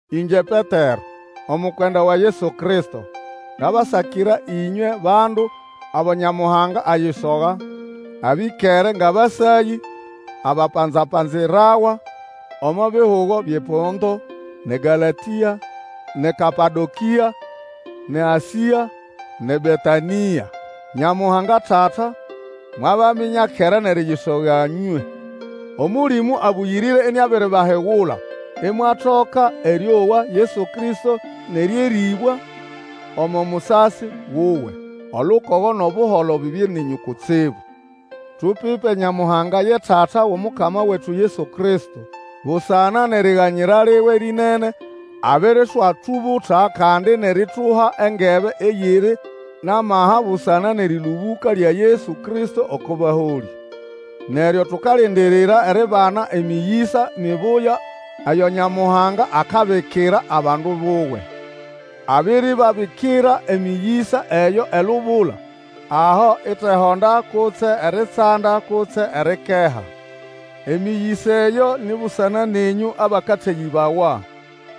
Ĩngye Petero, omukwenda wa Yesu Kristo, ngabasakira ĩnywe bandu abo Nyamuhanga ayisoga, abĩkere ngʼabasayĩ, abapanza-panzirawa omo bihugo byʼePonto, nʼeGalatĩa, nʼeKapadokĩa, nʼeAsĩa, nʼeBetanĩa. Nyamuhanga Tata, mwabaminya kera nʼeriyisoga nywe. Omũlĩmũ Abũyĩrĩre iniabiribahigula, imwatoka erĩowa Yesu Kristo nʼerĩerĩbwa omo musasi wuwe. Olukogo nʼobuholo bibye nenyũ kutsibu. Tupipe Nyamuhanga ye Tata wʼOmukama wetu Yesu Kristo! Busana nʼeriganyira liwe lĩnene, abiriswatubuta kandi nʼerituha engebe eyiri nʼamaha busana nʼerĩlũbũka lya Yesu Kristo oko baholĩ. Neryo tukalindirira eribana emĩyĩsa mibuya eyo Nyamuhanga akabikira abandu buwe. Abiribabikira emĩyĩsa eyo elubula, aho itehonda kutse eritsanda kutse erikeha. Emĩyĩsa eyo ni busana nenyũ abakateyĩbawa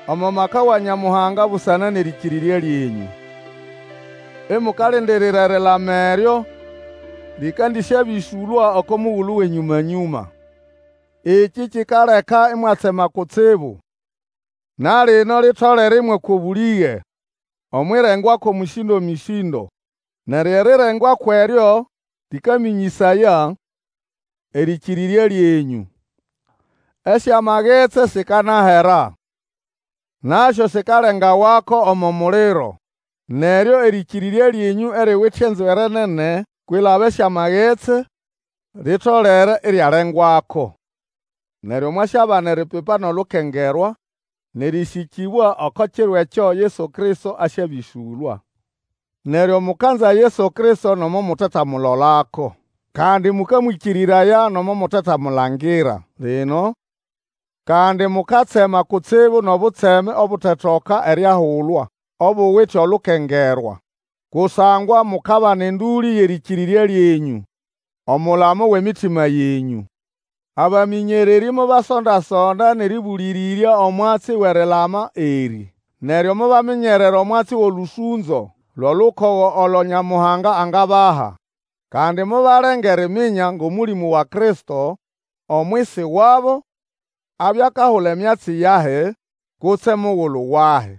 omo maka wa Nyamuhanga busana nʼerĩkĩrĩrya lyenyũ, imukalindirira erilama eryo likandisyabĩsũlwa oko mugulu wʼenyũma-nyũma. Ekĩ kikaleka imwatsema kutsibu, na lino litolere ĩmwakwa obũlĩge omwʼirengwako mĩsĩndo-mĩsĩndo. Neryo erirengwako eryo lĩkamĩnyĩsaya erĩkĩrĩrya lyenyũ. Esyamagetsi sikanahera, nasyo sikalengawako omo muliro. Neryo erĩkĩrĩrya lyenyũ eriwite enzwere nene kwilaba esyamagetsi, litolere iryalengwako. Neryo mwasyabana eripipa nʼolukengerwa, nʼerĩsĩkĩbwa oko kiro ekyo Yesu Kristo asyabĩsũlwa. Neryo mukanza Yesu Kristo nomo mutetamulolako, kandi mũkamwĩkĩrĩraya nomo mutetamulangira lino, kandi mukatsema kutsibu nʼobutseme obutetoka eriahulwa, obuwite olukengerwa. Kusangwa mukabana endũlĩ yʼerĩkĩrĩrya lyenyũ, omulamo wʼemitima yenyũ. Abamĩnyererĩ mobasonda-sonda nʼerĩbũlĩrĩrya omwatsi wʼerilama erĩ. Neryo mobaminyerera omwatsi wʼolũsũnzo lwʼolukogo olo Nyamuhanga angabaha. Kandi mobalenga eriminya ngʼOmũlĩmũ wa Kristo, omwisi wabo, abya akahula emyatsi yahi kutse mugulu wahi.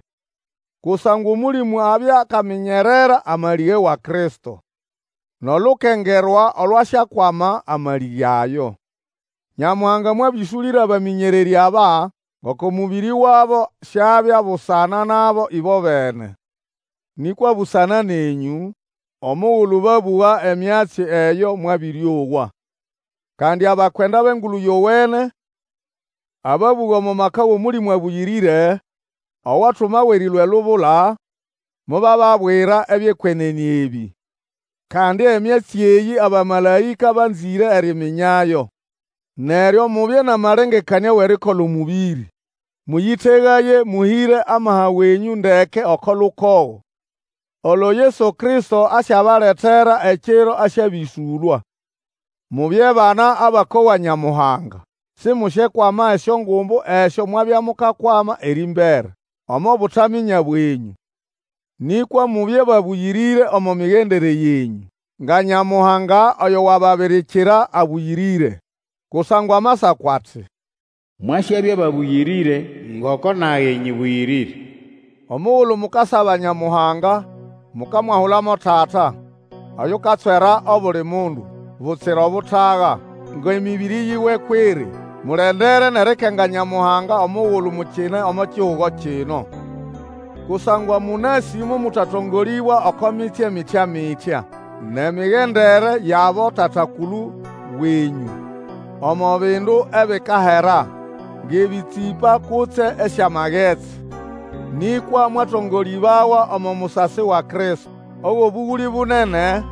Kusangwa Omũlĩmũ abya akaminyerera amalĩge wa Kristo, nʼolukengerwa olwasyakwama amalĩge ayo. Nyamuhanga mwabĩsũlĩra abamĩnyererĩ aba ngoko mũbĩrĩ wabo siabya busana nabo ĩbobene, nĩkwa busana nenyũ, omugulu babũga emyatsi eyo mwabĩrĩowa. Kandi abakwenda bʼEngulu Yowene, ababũga omo maka wʼOmũlĩmũ Abũyĩrĩre owatumawa erĩlũa elubula, mobababwira ebyʼekwenene ebĩ. Kandi emyatsi eyĩ abamalaĩka banzĩre eriminyayo. Neryo mubye nʼamalengekanĩa wʼerikola omũbĩrĩ. Mũyĩtegaye, mũhĩre amaha wenyũ ndeke oko lukogo olo Yesu Kristo asyabaletera ekiro asyabĩsũlwa. Mubye bana abakowa Nyamuhanga. Simusyekwama esyongumbu esyo mwabya mukakwama erĩmbere omo butaminya bwenyũ. Nĩkwa mubye babũyĩrĩre omo migendere yenyũ, nga Nyamuhanga oyo wababirikira abũyĩrĩre. Kusangwa Amasako ati, Mwasyabya babũyĩrĩre, ngoko nage nyĩbũyĩrĩre. Omugulu mukasaba Nyamuhanga, mukamwahula mo Tata, oyukatswera obuli mundu, butsira obutaga, ngʼemĩbĩrĩ yiwe kwʼiri; mulendere nʼerikenga Nyamuhanga omugulu mukine omo kihugo kino. Kusangwa mũnasĩ momũtatongolĩbwa oko mitsye mitya-mitya nʼemigendere yʼabotata-kulu wenyũ, omo bindu ebikahera, ngʼebĩtsĩpa kutse esyamagetsi. Nĩkwa mwatongolĩbawa omo musasi wa Kristo, owʼobũgũlĩ bunene,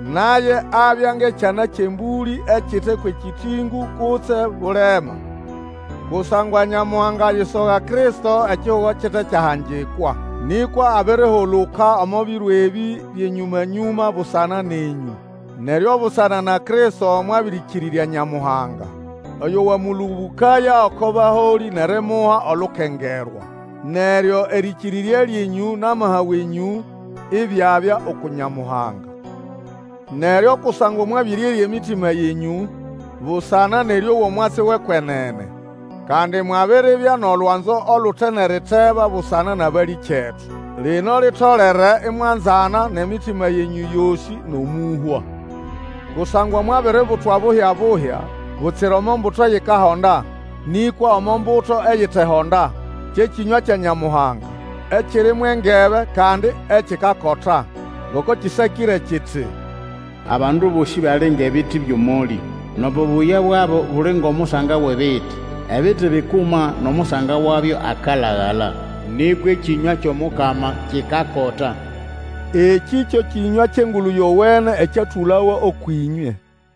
naye abya ngʼekyana kyʼembũlĩ ekite kwʼekĩtĩngũ kutse bulema. Kusangwa Nyamuhanga ayisoga Kristo ekihugo kite kyahangikwa. Nĩkwa abirihuluka omo biro ebĩ byʼenyũma-nyũma busana nenyũ. Neryo busana na Kristo mwabĩrĩkĩrĩrya Nyamuhanga oyo wamũlũbũkaya oko baholĩ nʼerimuha olukengerwa. Neryo erĩkĩrĩrya lyenyũ nʼamaha wenyũ ibyabya uku Nyamuhanga. Neryo kusangwa mwabĩrĩerya emitima yenyũ, busana nʼerĩowa omwatsi wʼekwenene, kandi mwabiribya nʼolwanzo olute nʼeriteba busana nʼabalĩkyetu, lino litolere imwanzana nʼemitima yenyũ yosĩ nʼomũhwa. Kusangwa mwabiributwa buhya-buhya, butsira omo mbuto eyikahonda, nĩkwa omo mbuto eyitehonda, kye kĩnywa kya Nyamuhanga, ekiri mwʼengebe, kandi ekikakota. Ngoko kĩsakĩre kiti, Abandu bosĩ bali ngʼebiti byʼomolĩ, Nʼobubuya bwabo buli ngʼomusanga wʼebiti. Ebiti bikuma nʼomusanga wabyo akalagala. Nĩkwa ekĩnywa kyʼomukama kikakota. Ekĩ kyo kĩnywa kyʼEngulu Yowene ekyatũlawa ũkwʼĩnywe.